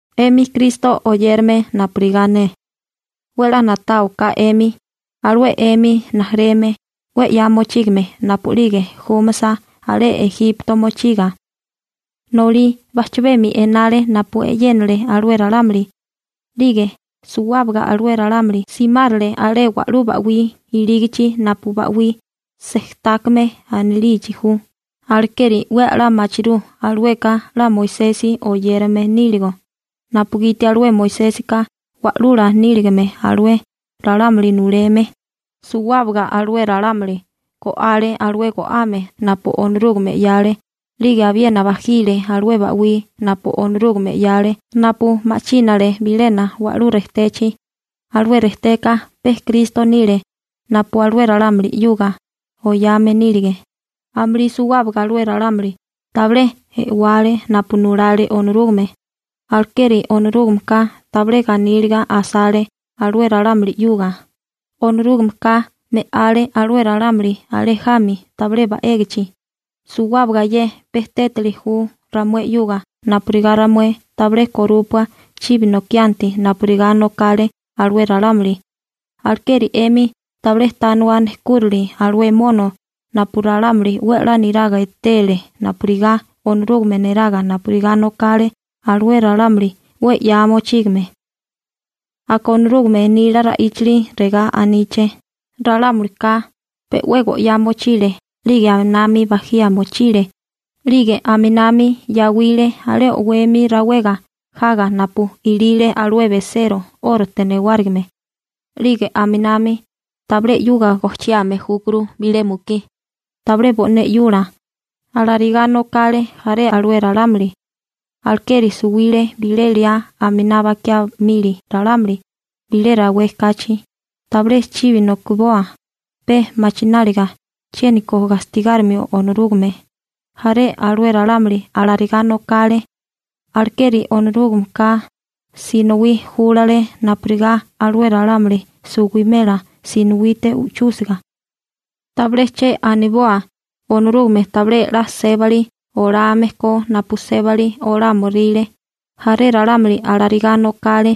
'Emi Kristo oyérame napurigá ne, 'we 'la na'táwaká 'emi, alué 'emi rijimala 'we 'ya mochígame napu'lige júmasa alé Ejipto mochiga, nolí bajchabemi enale napu e'yénale alué ralámuli, 'lige suwábaga alué ralámuli simárale alé wa'lú ba'wí ilígichi napu Ba'wí Sejtákame anilichi ju. Alekeri 'we a'lá machirú alueka 'la Moisesi oyérame níligo, napugiti alué Moisésika wa'lula níligame alué ralámuli nuleme. Suwábaga alué ralámuli go'ale alué go'ame napu Onorúgame 'yale. 'Lige abiena bajile alué ba'wí napu Onorúgame 'yale napu ma'chínale bilena wa'lú rejtechi. Alué rejteka pe Kristo nile napu alué ralámuli 'yuga oyame nílige. Amulí suwábaga alué ralámuli tabilé e'wale napu nulale Onorúgame. Alekeri Onorúgameka tabilé ganíliga asale alué ralámuli 'yuga. Onorúgameka me'ale alué ralámuli alé jami tabilé ba'égichi. Suwábaga ye pe tétali ju ramué 'yuga napurigá ramué tabilé korúpua chibi nokianti napurigá nokale alué ralámuli. Alekeri 'emi tabilé tániwa nejkúrali alué mono napu ralámuli 'we 'la niraga etele napurigá Onorúgame neraga napurigá nokale alué ralámuli 'we 'ya mochígame. Aka Onorúgame nila ra'íchali regá aníché: «Ralámulika pe'wé go'yá mochile 'lige aminami bajía mochile 'lige aminami yawile alé o'wemi rawega jaga napu ilile alué besero 'órote newárigime.» 'Lige aminami tabilé 'yuga gojchiame júkuru bilé mukí tabilé bo'né 'yula. Alarigá nokale jaré alué ralámuli, alekeri suwile bilé liá aminá bakiá mili ralámuli bilé rawé kachi. Tabilé chibi nokiboa pe machináliga chiéniko gastigárimio Onorúgame. Jaré alué ralámuli alarigá nokale, alekeri Onorúgameka sinowí júlale napurigá alué ralámuli suwimela sinowite u'chúsiga. Tabilé che aniboa Onorúgame tabilé 'la sébali olame ko napu sébali olámoríle. Jaré ralámuli alarigá nokale,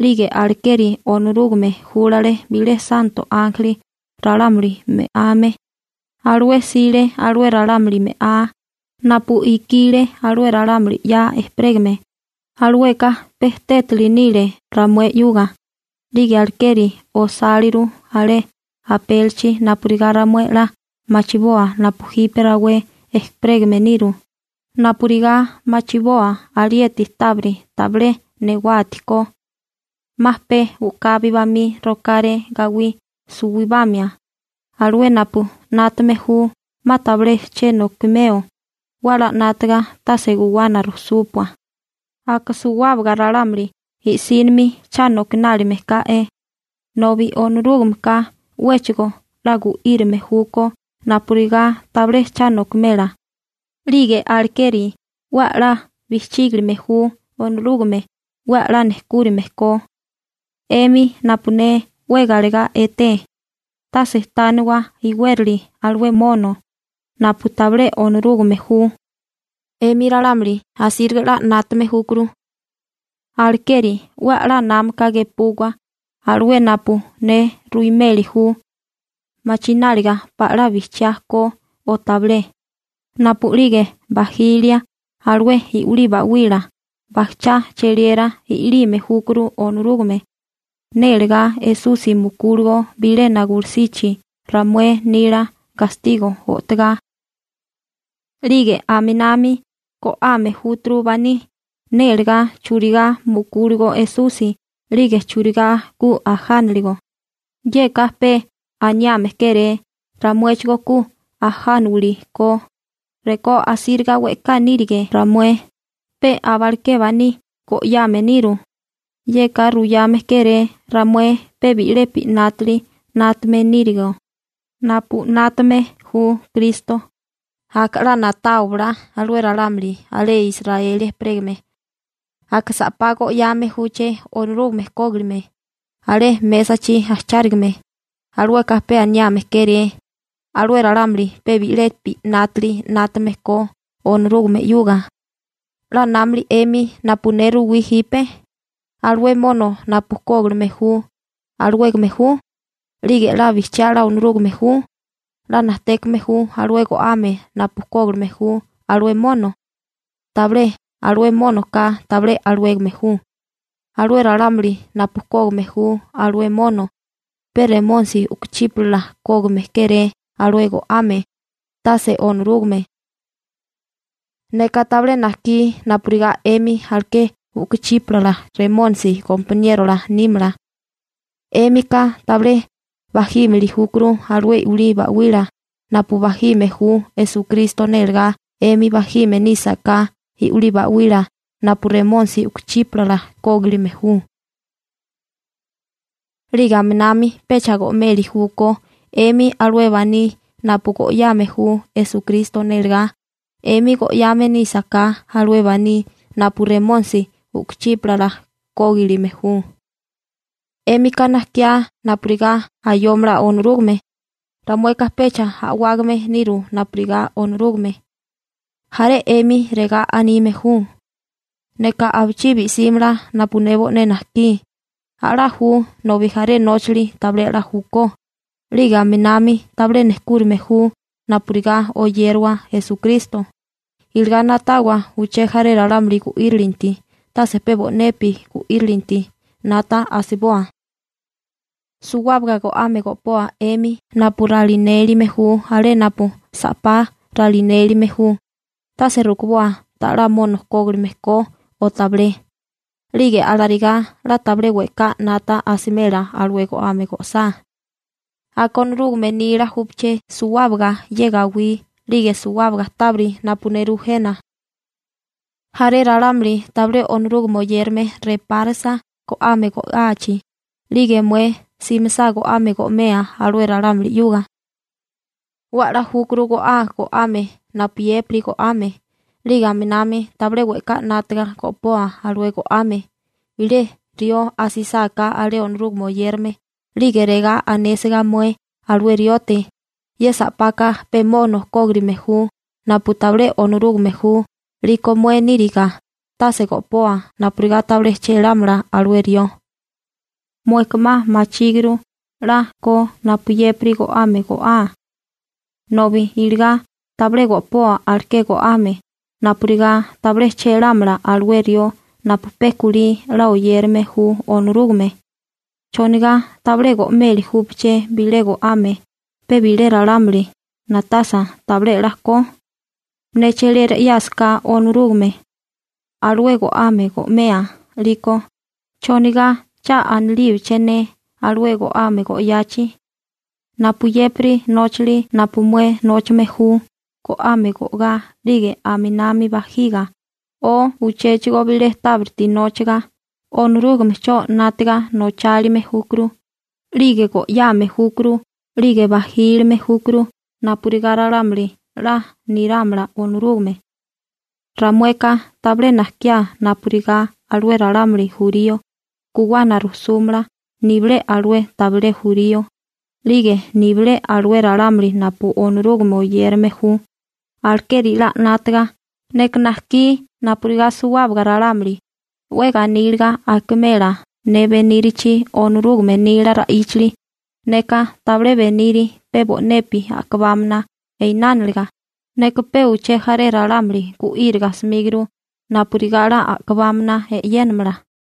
'lige alekeri Onorúgame júlale bilé santo ánjeli ralámuli me'ame. Alué 'sile alué ralámuli me'á. Napu ikile alué ralámuli 'ya ejperégame, alueka pe tétili nile ramué 'yuga. 'Lige alekeri osáliru alé apélichi napurigá ramué 'la machiboa napu jipe rawé ejperégame niru, napurigá machiboa alieti tábiri tabilé newati ko. 'Ma pe u'kabi bamí rokáré gawí suwibamia. Alué napu 'nátame ju 'ma tabilé che nokimeo, ¡'we 'la 'nátaga tase guwana rujsúpua! Aka suwábaga ralámuli i'sínimi cha nokinálime ká'é, nobi Onorúgameka 'wéchigo 'la gu'írame júkó napurigá tabilé cha nokimela. 'Lige alekeri 'we 'la bijchígilime ju Onorúgame 'we 'la nejkúrime ko. 'Emi napu ne 'we galegá eté, tase tániwa iwérali alué mono napu tabilé Onorúgame ju. 'Emi ralámuli asíriga 'la 'nátame júkuru, alekeri 'we a'lá námaka gepuwa alué napu ne ruimeli ju machináliga pala bijchiá ko o tabilé. Napu'lige bajilia alué i'wilí ba'wila, bajchá cheliera i'lime júkuru Onorúgame nélegá Esusi mukúligo bilena gulusichi ramué nila gastigo o'togá, 'lige aminami go'ame júturu baní nélagá churigá mukúligo Esusi 'lige churigá ku ajánaligo. Yeka pe aniame kéré ramuéchigó ku ajániwili ko. Rekó asíriga we'ká nírige ramué, pe abaleké baní go'yame niru. Yeka ruyame kéré ramué pe bi'lepi 'nátali 'nátame nírigo napu 'nátame ju Kristo. Aka 'la na'táwabala alué ralámuli alé Israeli ejperégame, aka sa'pá go'yame júché Onorúgame kógilime alé mésachi ajchárigame. Alueka pe aniame kéré alué ralámuli pe bi'lepi 'nátali 'nátame ko Onorúgame 'yuga. ¿'La námilia 'emi napu ne ruwí jipe? Alué mono napu kógilime ju, ¿alawégame ju? 'Lige ¿'la bijchiá 'la Onorúgame ju? ¿'We najtékame ju alué go'ame napu kógilime ju alué mono? Tabilé. Alué mónoka tabilé alawégame ju. Alué ralámuli napu kógime ju alué mono, pe remónisi u'kuchípala kógime kéré alué go'ame, tase Onorúgame. Neka tabilé najkí napurigá 'emi aleké u'kuchípala remónisi gompaníerola nímala. 'Émika tabilé bajímili júkuru alué i'wilí ba'wila napu bajílime ju Esukristo nélagá 'emi bajime nísaká i'wilí ba'wila napu remónisi u'kuchípala kógilime ju. 'Lige aminami pecha go'meli júkó 'emi alué baní napu go'yame ju Esukristo nélagá 'emi go'yame nísaká alué baní napu remónisi u'kuchípala kógilime ju. ¿'Émika najkiá napurigá ayómala Onorúgame? Ramueka pecha a'wágame niru napurigá Onorúgame. Jaré 'emi regá anime ju: «Neka abichibi símala napu ne bo'né najkí.» A'lá ju nobi jaré nóchali tabilé 'la júkó 'lige aminami tabilé nejkúrime ju napurigá oyérawa Esukristo. Iligá na'tawa uché jaré ralámuli gu'írilinti, tase pe bo'nepi gu'írilininti 'nata asiboa. Suwábaga go'ame go'poa 'emi napu ralinélime ju alé napu sa'pá ralinélime ju. Tase rukuboa tala 'la mono kógirime ko o tabilé. 'Lige alarigá 'la tabilé we'ká 'nata asimela alué go'ame go'sá. Aka, «Onorúgame nila júpaché suwábaga ye gawí 'lige suwábaga tábiri napu nerú jena.» Jaré ralámuli tabilé Onorúgame oyérame repárisa go'ame go'áachi, 'lige mué simisá go'ame go'mea alué ralámuli 'yuga, 'we a'lá júkuru go'aa go'ame napuyépiri go'ame. 'Lige aminami tabilé we'ká 'nátiga go'poa alué go'ame. Bilé rió asisáká alé Onorúgame oyérame 'lige regá anésiga mué alué riote: «Ye sa'paka pe mono kógirime ju napu tabilé Onorúgame ju», 'liko mué níriga tase go'poa napurigá tabilé chélámala alué rió. Mueka 'ma machíguru 'la ko napuyépiri go'ame go'aa, nobi iligá tabilé go'poa aleké go'ame napurigá tabilé chélámala alué rió napu pe kulí 'la oyérame ju Onorúgame. ¿Chonigá tabilé go'meli júpaché bilé go'ame pe bilé ralámuli na'tasa tabilé 'la ko? Ne cheliera 'yásaká Onorúgame alué go'ame go'mea 'liko, ¿chonigá cha anilíbiché ne alué go'ame go'yachi? Napuyépiri nóchali napu mué nóchame ju, go'ame go'gá 'lige aminami bajiga o uchéchigo bilé tábiriti nóchaga, Onorúgamecho 'nátiga nochálime júkuru 'lige go'yame júkuru 'lige bajílime júkuru napurigá ralámuli 'la nirámala Onorúgame. Ramueka tabilé najkiá napurigá alué ralámuli jurío guwana rusúmala nibilé alué tabilé jurío, 'lige nibilé alué ralámuli napu Onorúgame oyérame ju. Alekeri 'la 'nátaga. Neka najkí napurigá suwábaga ralámuli 'we ganíliga akimela ne benírachi Onorúgame nila ra'íchali. Neka tabilé beniri pe bo'nepi a'kabámana einániliga, neka pe uché jaré ralámuli gu'íriga 'smíguru napurigá 'la a'kabámana e'yénamala.